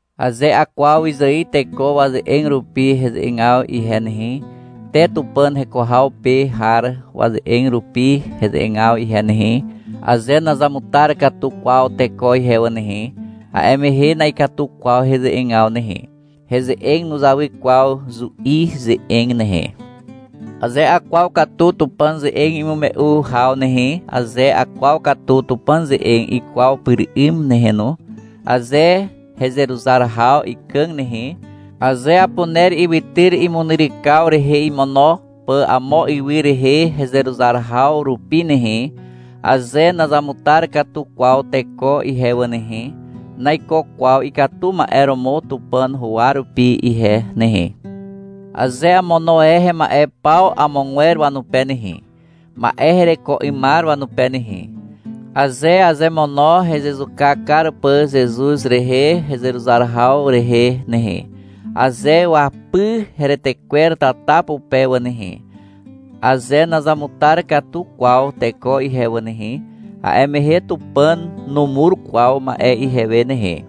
Aze akwaw wyzài teko waze'eg rupi heze'egaw ihe nehe, te Tupàn heko haw pe har waze'eg rupi heze'egaw ihe nehe, aze nazamutar katu kwaw teko ihe wà nehe, a'e mehe na'ikatu kwaw heze'egaw nehe. Heze'eg nuzawy kwaw zu'i ze'eg nehe. Aze akwaw katu Tupàn ze'eg imume'u haw nehe, aze akwaw katu Tupàn ze'eg ikwaw pyr 'ym nehe no, aze hezeruzar haw ikàg nehe, aze apuner ywytyr imunyrykaw rehe imono pà amo ywy rehe hezeruzar haw rupi nehe, aze nazamutar katu kwaw teko ihe wà nehe, naiko kwaw ikatu ma'e romo Tupàn huwa rupi ihe nehe. Aze amono e hema'e paw amogwer wanupe nehe, ma'e hereko 'ymar wanupe nehe, aze azemono hezezuka kar pà Zezuz rehe hezeruzar haw rehe nehe, aze wapy heretekwer tata pupe wà nehe, aze nazamutar katu kwaw teko ihe wà nehe, a'e mehe Tupàn numur kwaw ma'e ihewe nehe.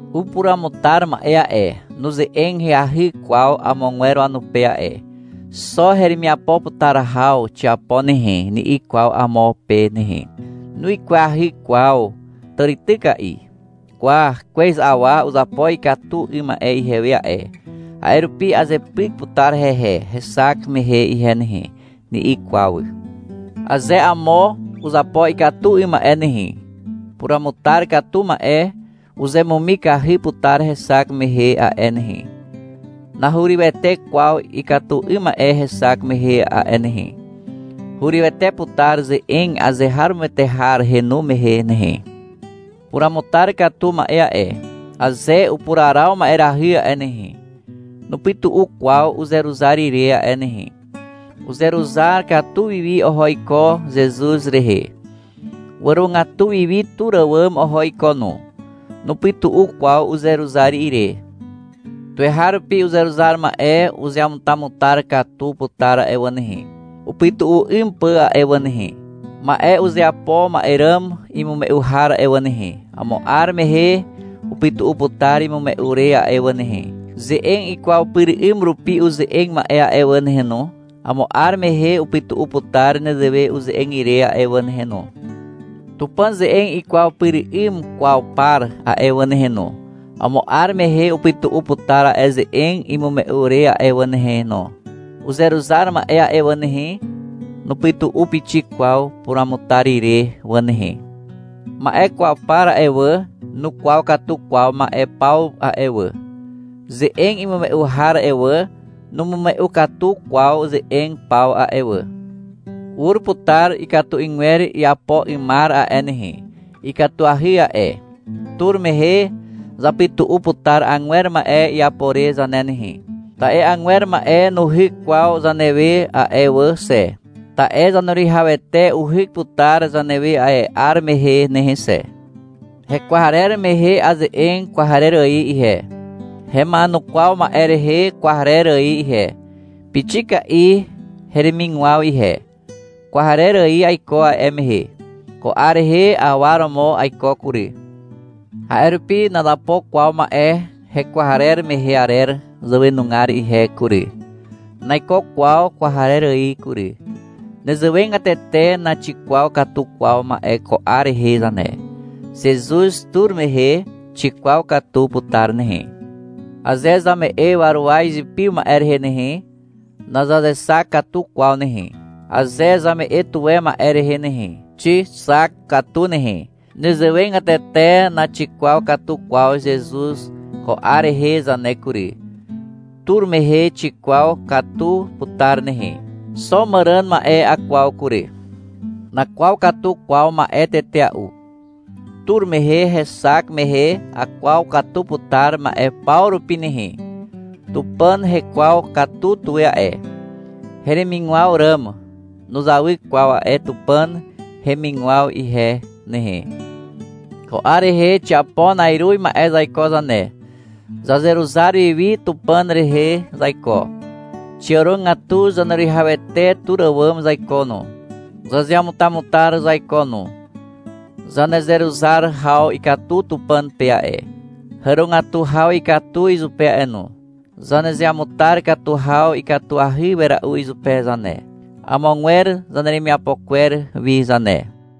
Upuruamutar ma'e a'e, nuze'eg ahyahy kwaw amogwer wanupe a'e. — Xo heremiapo putar haw xiapo nehe, ni'i kwaw amo pe nehe. Nuikwahy kwaw tàrityka'i. — Kwa, kwez awa uzapo ikatu 'ym ma'e ihewe a'e, a'e rupi azepyk putar hehe hexak mehe ihe nehe, ni'i kwaw. Aze amo uzapo ikatu 'ym ma'e nehe, puruamutar katu ma'e uzemumikahy putar hexak mehe a'e nehe, nahurywete kwaw ikatu 'ym ma'e hexak mehe a'e nehe. Hurywete putar ze'eg azeharomoete har henu mehe nehe. Puramutar katu ma'e a'e, aze upuraraw ma'erahy a'e nehe, nupytu'u kwaw uzeruzar ire a'e nehe. Uzeruzar katu wiwi oho iko Zezuz rehe. Wàrogatu wiwi tur àwàm oho iko no. Nupytu'u kwaw uzeruzar ire. Tuweharupi uzeruzar ma'e uzeamutamutar katu putar a'e wà nehe, upytu'u 'ym pà a'e wà nehe. Ma'e uzeapo ma'e ràm imume'u har a'e wà nehe, amo 'ar mehe upytu'u putar imume'u re a'e wà nehe. Ze'eg ikwaw pyr 'ym rupi uze'eg ma'e a'e wà nehe no, amo 'ar mehe upytu'u putar nezewe uze'eg ire a'e wà nehe no. Tupàn ze'eg ikwaw pyr 'ym kwaw par a'e wà nehe no, amo 'ar mehe upytu'u putar a'e ze'eg imume'u re a'e wà nehe no. Uzeruzar ma'e a'e wà nehe, nupytu'u pixik kwaw puruamutar ire wà nehe. Ma'e kwaw par a'e wà, nukwaw katu kwaw ma'e paw a'e wà. Ze'eg imume'u har a'e wà, numume'u katu kwaw ze'eg paw a'e wà. Ur putar ikatu 'ygwer iapo 'ymar a'e nehe, ikatuahy a'e. Tur mehe zapytu'u putar agwer ma'e iapo re zane nehe. Ta'e agwer ma'e nuhyk kwaw zanewe a'e wà xe. Ta'e Zaneruwihawete uhyk putar zanewe a'e 'ar mehe nehe xe. Hekwarer mehe aze'eg kwarer ài ihe, hema'enukwaw ma'e rehe kwarer ài ihe, pixika'i heremigwaw ihe. Kwarer ài aiko a'e mehe. Ko 'ar rehe awa romo aiko kury. A'e rupi nazapo kwaw ma'e hekwarer mehe arer zàwenugar ihe kury. Naiko kwaw kwarer ài kury. (Nezewegatete naxikwaw katu kwaw ma'e ko 'ar rehe zane. Zezuz tur mehe xikwaw katu putar nehe.) Aze zame'e waruwa izipiw ma'e rehe nehe, nazazexak katu kwaw nehe. Aze zame'e tuwe ma'e rehe nehe, xixak katu nehe. Nezewegatete naxikwaw katu kwaw Zezuz ko 'ar rehe zane kury. Tur mehe xikwaw katu putar nehe. Xo màràn ma'e akwaw kury. Nakwaw katu kwaw ma'e tetea'u. Tur mehe hexak mehe akwaw katu putar ma'e paw rupi nehe. Tupàn hekwaw katu tuwe a'e. Heremigwaw ràm nuzawy kwaw a'e Tupàn hemigwaw ihe nehe. Ko 'ar rehe xiapo na'iruz ma'e zaiko zane. Zazeruzar wiwi Tupàn rehe zaiko. Xiàrogatu Zaneruwihawete tur àwàm zaiko no. Zazeamutamutar zaiko no. Zanezeruzar haw ikatu Tupàn pe a'e. Hàrogatu haw ikatu izupe a'e no. Zanezeamutar katu haw ikatuahy wera'u izupe zane, amogwer zaneremiapo kwer wi zane.